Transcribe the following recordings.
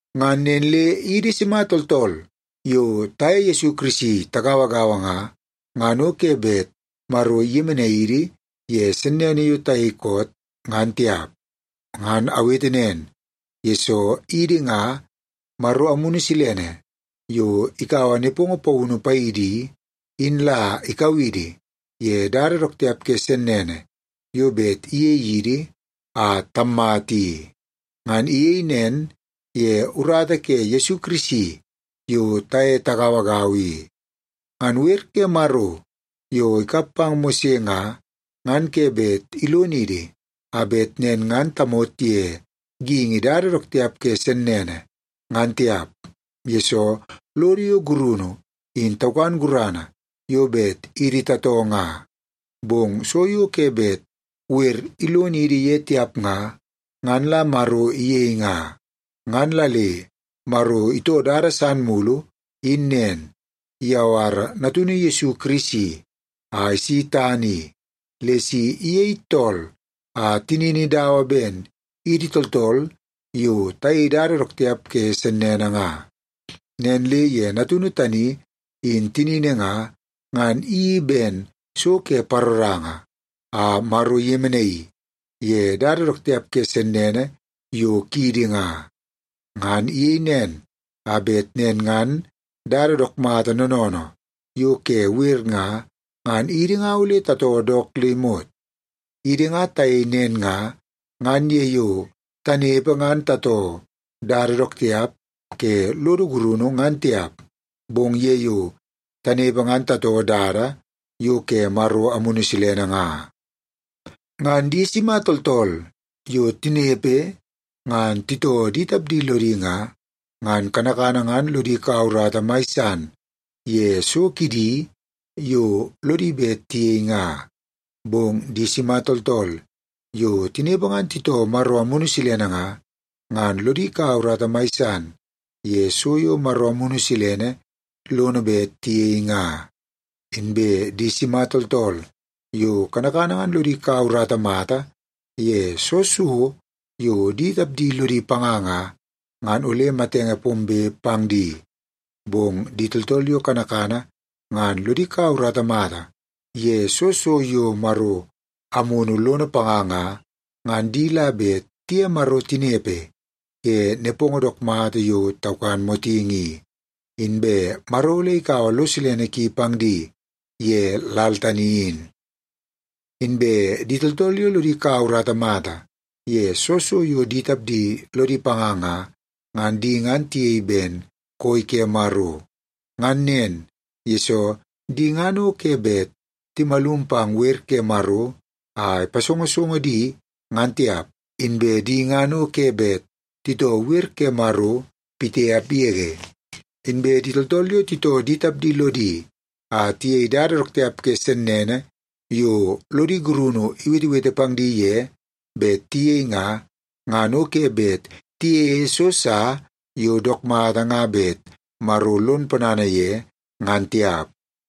Ngan nen le idi sima tooltool yo taye Yesu Kirisi tagauagaua nga, ngan o ke bet Maro iyemenai idi ye sennene yo tayei koot, ngan tiap. Ngan awete nen, yesoo idi nga, Maro Amunu Silene yo ikaua nepongo paunu paidi i, in la ikau idi ye dada dook tiap ke sennene yo bet iyei idi a tammata i. Ngan iyei nen ye urata ke Yesu Kirisi yo taye tagauagaua i. Ngan wer ke Maro yo ikap pang Mose nga, ngan ke bet ilonidi a bet nen ngan tamot ye geingi dada dook tiap ke sennene, ngan tiap, yesoo lodo yo gurunu in taukan gurana yo bet idi tatoo nga. Bong so yo ke bet wer ilonidi ye tiap nga, ngan la Maro iyei nga. Ngan la le Maro itoo dada san mulu in nen; iyawara Natunu Yesu Kirisi a isi tana i, le si iyei tool a tinini dawa ben idi tooltool yo tayei dada dook tiap ke sennene nga. Nen le ye Natunu tani in tinini nga, ngan iyeii ben so ke paroranga, a Maro iyemenaii ye dada dook tiap ke sennene yo kiidi nga. Ngan iyei nen, a bet nen ngan dada dook mata noonoonoo yo ke wer nga, ngan idi nga ole tatoo dook le imot. Idi nga tayei nen nga, ngan ye yo tanepe ngan tatoo dada dook tiap ke lodo gurunu ngan tiap, bong ye yo tanepe ngan tatoo dada yo ke Maro Amunu Silene nga. Ngan di sima tooltool yo tinepe ngan titoo di tapdi lodi nga, ngan kanakana ngan lodi kaua urata mai san ye so kidi yo lodi bet tiyei nga. Bong di sima tooltool yo tinepe ngan titoo Maro Amunu Silene nga, ngan lodi kaua urata mai san ye so yo Maro Amunu Silene lono bet tiyei nga. Inbe di sima tooltool yo kanakana ngan lodi kaua urata mata ye soo so yo di tapdi lodi panga nga, ngan ole matenge pombe pang di. Bong di tooltool yo kanakana ngan lodi kaua urata mata ye soo so yo Maro Amunu lono panga nga, ngan di la bet tiye Maro tinepe ye nepongo dook mata yo taukan motingi i, inbe Maro ole ikaua lo silene ki pang di ye lal tani in. Inbe di tooltool yo lodi kaua urata mata ye soo so yo di tapdi lodi panga nga, ngan di ngan tiyei ben koi ke Maro. Ngan nen, yesoo di ngan o ke bet timalum pang wer ke Maro a ipasongosongo di, ngan tiap, inbe di ngan o ke bet titoo wer ke Maro pitiap yege. Inbe di tooltool yo titoo di tapdi lodi a tiyei dada dook tiap ke sennene yo lodi gurunu iwetewete pang di ye bet tiyei nga, ngan o ke bet tiyeie so sa yo dook mata nga bet Maro lon ponana ye, ngan tiap.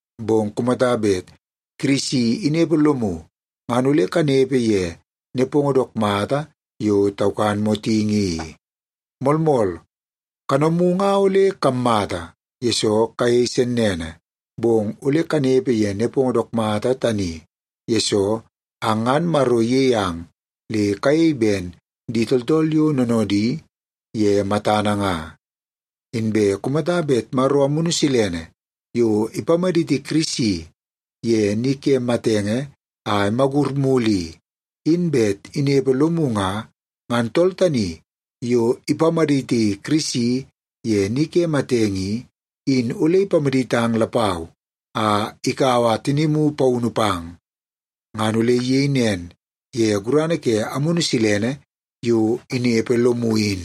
Bong kumata bet Kirisi inepe lomu, ngan ole kanepe ye nepongo dook mata yo taukan motingi i. Moolmool, kanomu nga ole kammata, yesoo kayei sennene, bong ole kanepe ye nepongo dook mata tani, yesoo ang ngan Maro iyei ang le kayei ben di tooltool yo noonoodi ye matana nga. Inbe kumata bet Maro Amunu Silene yo ipamaditi Kirisi ye ni ke matenge a imagur mulu i, in bet inepe lomu nga, ngan tool tani yo ipamaditi Kirisi ye ni ke matenge i, in ole ipamaditang lapau a ikaua tinimu paunu pang. Ngan ole iyei nen ye gurana ke Amunu Silene yo inepe lomu in.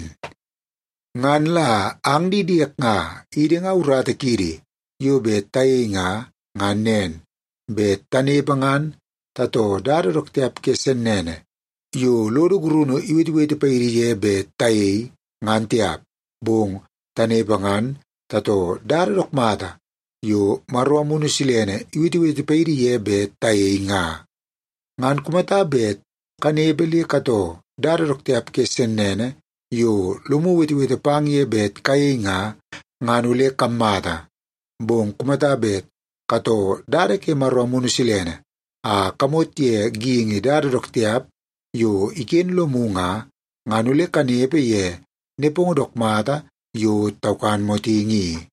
Ngan la ang di diek nga, idi nga urata kiidi yo bet tayei nga, ngan nen; bet tanepe ngan tatoo dada dook tiap ke sennene yo lodo gurunu iwetewete paidi ye bet tayei, ngan tiap. Bong tanepe ngan tatoo dada dook mata yo Maro Amunu Silene iwetewete paidi ye bet tayei nga. Ngan kumata bet kanepe le katoo dada dook tiap ke sennene yo lomu iwetewete pang ye bet kayei nga, ngan ole kammata. Bong kumata bet katoo dada ke Maro Amunu Silene a kamot ye geingi dada dook tiap yo iken lomu nga, ngan ole kanepe ye nepongo dook mata yo taukan motingi i.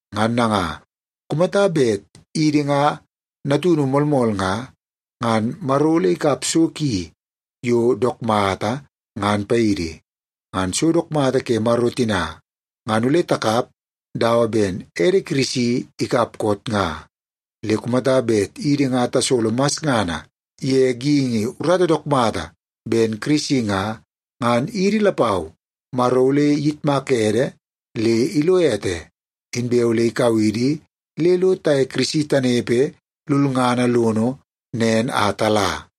Ngan nanga, kumata bet idi nga natunu moolmool nga, ngan Maro ole ikap so ki yo dook mata, ngan paidi. Ngan so dook mata ke Maro tina, ngan ole takap dawa ben ede Kirisi ikap koot nga. Le kumata bet idi nga tasolo masngana ye geingi urata dook mata ben Kirisi nga, ngan idi lapau Maro ole iyitmak ede le ilo ete, inbe ole ikau idi le lo taye Kirisi tanepe lulngana lono nen a tala.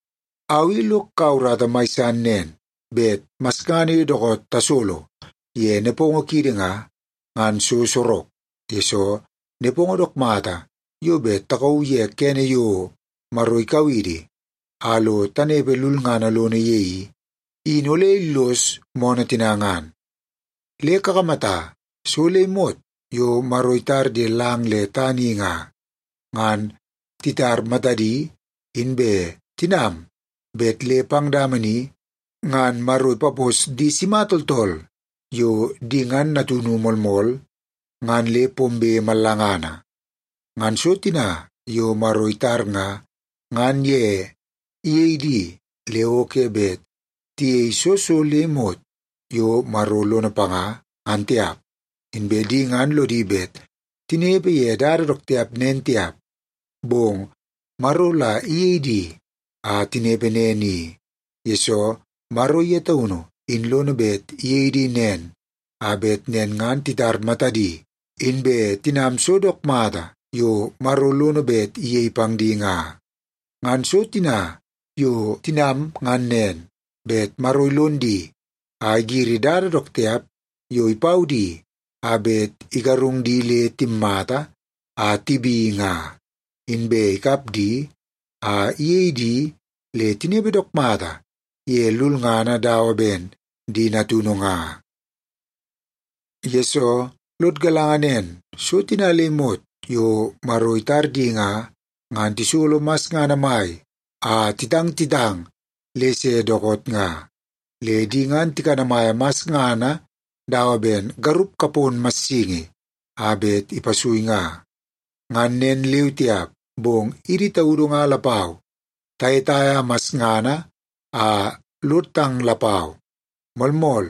Au i lok kaua urata mai san nen, bet masngana yo dookoot tasolo ye nepongo kiidi nga, ngan so sorok, yesoo nepongo dook mata yo bet takauu ye kene yo Maro ikau idi a lo tanepe lulngana lono ye i, in ole illos moonoo tina nga. Le kakamata, so le imot yo Maro itar ye lang le tana i nga, ngan titar matadi inbe tinam bet le pang dama ni ngan Maro ipapos di sima tooltool yo di ngan natunu moolmool ngan le pombe mallangana. Ngan so tina yo Maro itar nga, ngan ye iyei di le o ke bet tiyei soo so le imot yo Maro lono panga, ngan tiap. Inbe di ngan lodi bet tinepe ye dada dook tiap nen tiap, bong Maro la iyei di a tinepe nen i, yesoo Maro ye taunu in lono bet iyei di nen, a bet nen ngan titar matadi inbe tinam so dook mata yo Maro lono bet iyei pang di nga. Ngan so tina yo tinam ngan nen, bet Maro ilon di a igiri dada dook tiap yo ipau di a bet igarung di le timmata a tibi nga, inbe ikap di a iyei di le tinepe dook mata ye lulngana dawa ben di natunu nga. Yesoo, lod galanga nen, so tina le imot yo Maro itar di nga, ngan tisolo masngana mai a titang titang le se dookoot nga. Le di ngan tikanamaia masngana dawa ben garup kapon massingi a bet ipasui nga. Ngan nen leu tiap, bong idi taudu nga lapau, tayetaia masngana a lod tang lapau. Moolmool,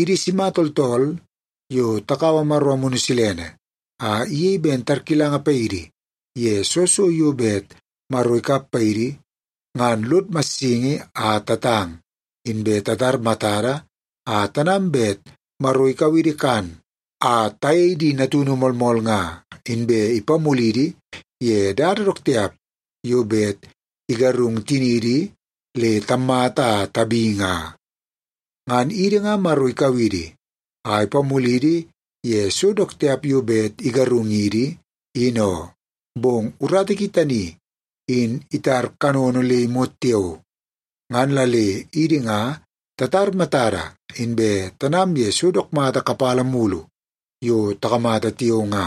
idi sima tooltool yo takaua Maro Amunu Silene a iyei ben tarkilanga paidi ye soo so yo bet Maro ikap paidi, ngan lod massingi a tatang, inbe titar matada a tanam bet Maro ikau idi kan a tayei di natunu moolmool nga, inbe ipamulidi ye dada dook tiap yo bet igarung tiniidi le tammata a tabi nga. Ngan idi nga Maro ikau idi a ipamulidi ye so dook tiap yo bet igarungidi, in oo, bong urata ki tani in itar kanono le imot tiao. Ngan la le idi nga tatar matada inbe tanam ye so dook mata kapala mulu yo takamata tiao nga.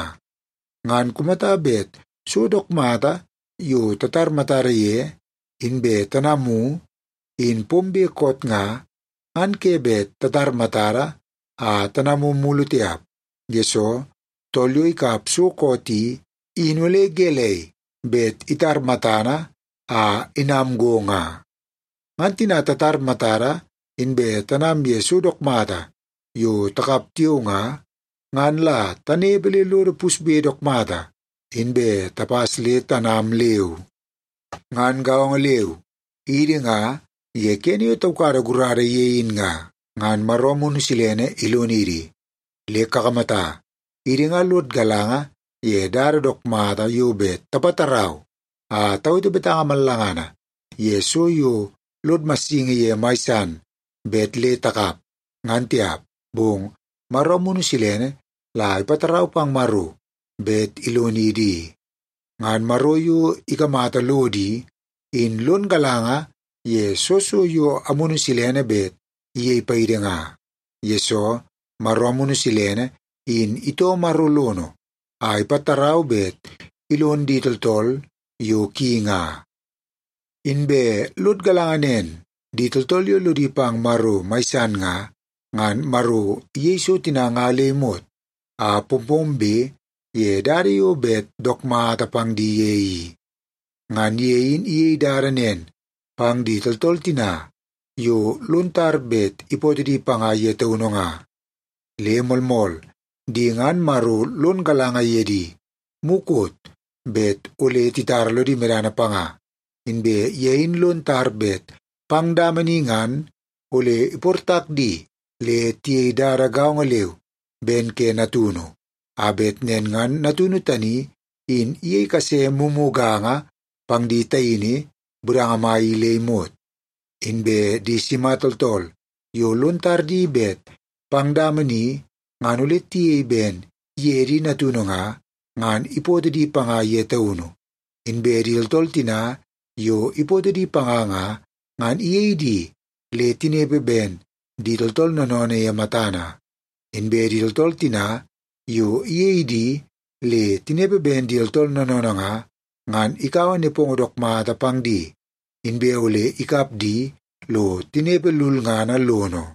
Ngan kumata bet so dook mata yo tatar matada ye inbe tanamu, in pombe koot nga, ngan ke bet tatar matada a tanamu mulu tiap, yesoo tool yo ikap so koot i, in ole gelei bet itar matana a inam go nga? Ngan tina tatar matada inbe tanam ye so dook mata yo takap tiao nga, ngan la tanepe le lodo pusbe dook mata, inbe tapas le tanam leu. Ngan gaongo leu, idi nga ye kene yo taukada gurada ye in nga, ngan Maro Amunu Silene ilonidi. Le kakamata, idi nga lod galanga ye dada dook mata yo bet tapatarau a tawete betanga mallangana ye so yo lod massingi ye mai san bet le takap, ngan tiap, bong Maro Amunu Silene la ipatarau pang Maro bet ilonidi i. Ngan Maro yo ikamata lodo i, in lon galanga ye soo so yo Amunu Silene bet iyei paidi nga, yesoo Maro Amunu Silene in itoo Maro lono a ipatarau bet ilon di tooltool yo ki nga. Inbe lod galanga nen, di tooltool yo lodi pang Maro mai san nga, ngan Maro iyei so tina nga le imot a pompombe ye dada yo bet dook mata pang di ye i. Ngan ye in iyei dada nen pang di tooltool tina yo lon tar bet ipootoo di panga ye taunu nga. Le moolmool, di ngan Maro lon galanga ye di mukot bet ole titara lodi medana panga, inbe ye in lon tar bet pang dama ni ngan ole iportak di le tiyei dada gaongo leu ben ke Natunu, a bet nen ngan Natunu tani in iyei kase mumuganga pang di taini budanga mai i le imot. Inbe di sima tooltool yo lon tar di bet pang dama ni ngan ole tiyei ben ye di natunu nga, ngan ipootoo di panga ye taunu. Inbe di tooltool tina yo ipootoo di panga nga, ngan iyei di le tinepe ben di tooltool noonoonoo ye matana. Inbe di tooltool tina yo iyei di le tinepe ben di tooltool noonoonoo nga, ngan ikaua nepongo dook mata pang di, inbe ole ikap di lo tinepe lulngana lono.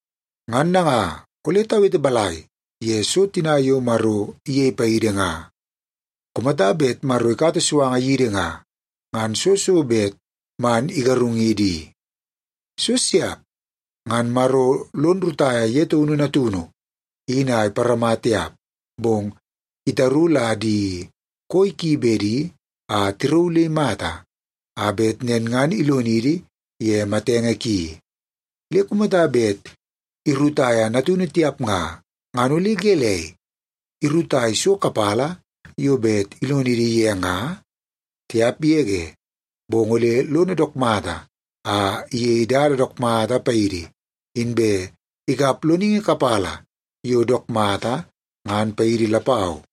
Ngan nanga, ole tawete balai ye so tina yo Maro iyei paidi nga? Kumata bet Maro ikata suanga yidi nga, ngan soo so bet man igarungidi i? So siap! Ngan Maro lon rutaia ye taunu Natunu in a iparama tiap, bong itaru la di koi ki bedi a tirauu le imata, a bet nen ngan ilonidi ye matenge ki. Le kumata bet irutaia Natunu tiap nga, ngan ole gelei, irutai so kapala yo bet ilonidi ye nga? Tiap yege! Bong ole lono dook mata a iyei dada dook mata paidi, inbe ikap loningi kapala yo dook mata, ngan paidi lapau.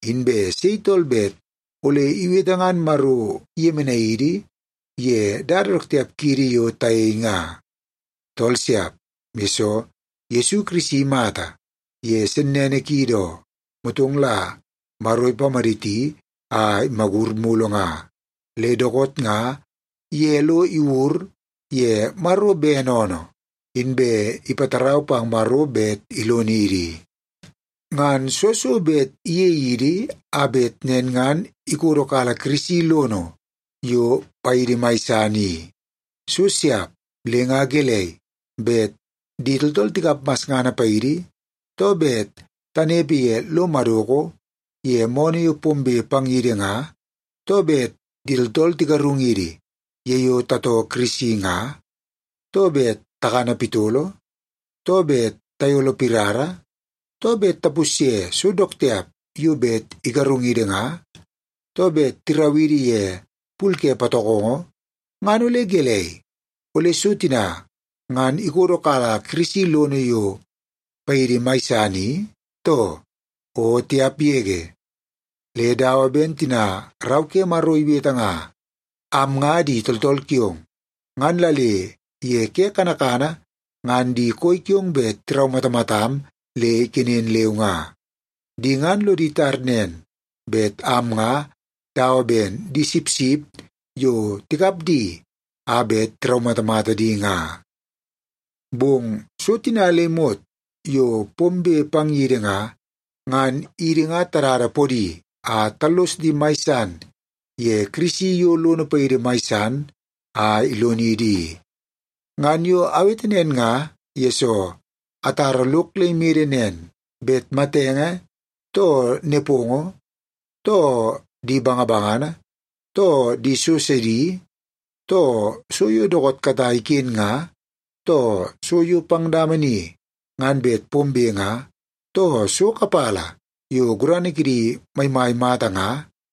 Inbe sei tool bet ole iwete ngan Maro iyemenai idi ye dada dook tiap kiidi yo tayei nga? Tool siap, yesoo Yesu Kirisi imata ye sennene kiidi oo, motong la Maro ipamaditi a imagur mulu nga. Le dookoot nga, ye lo iwur ye Maro bene oonoo, inbe ipatarau pang Maro bet ilonidi. Ngan soo so bet iyei idi a bet nen ngan ikodokala Kirisi lono yo paidi mai san i? So siap! Le nga gelei, bet di tooltool tikap masngana paidi, too bet tanepe ye lo madoko ye moonoo yo pombe pang yidi nga, too bet di tooltool tigarungidi ye yo tatoo Kirisi nga, too bet takana pitolo, too bet tayolo pirara, too bet tapusye so dook tiap yo bet igarungidi nga, too bet tirau idi ye pul ke patokongo, ngan ole gelei, ole so tina ngan ikodokala Kirisi lono yo paidi mai san i, too? O tiap yege! Le dawa ben tina Rau ke Maro iwete nga, “Am nga di tooltool kiong, ngan la le ye ke kanakana ngan di koi kiong bet tiraumatamatam le ikenen leu nga. Di ngan lodi tar nen, bet am nga dawa ben di sipsip yo tikap di a bet tiraumatamata di nga.” Bong so tina le imot yo pombe pang yidi nga, ngan idi nga tadada podi a tallos di mai san ye Kirisi yo lono paidi mai san a ilonidi i. Ngan yo awete nen nga, yesoo atara lok le imede nen, bet matenge, too nepongo, too di bangabangana, too di so sidi, too so yo dookoot katai iken nga, too so yo pang dama ni ngan bet pombe nga, too so kapala yo gurana kidi maimai mata nga,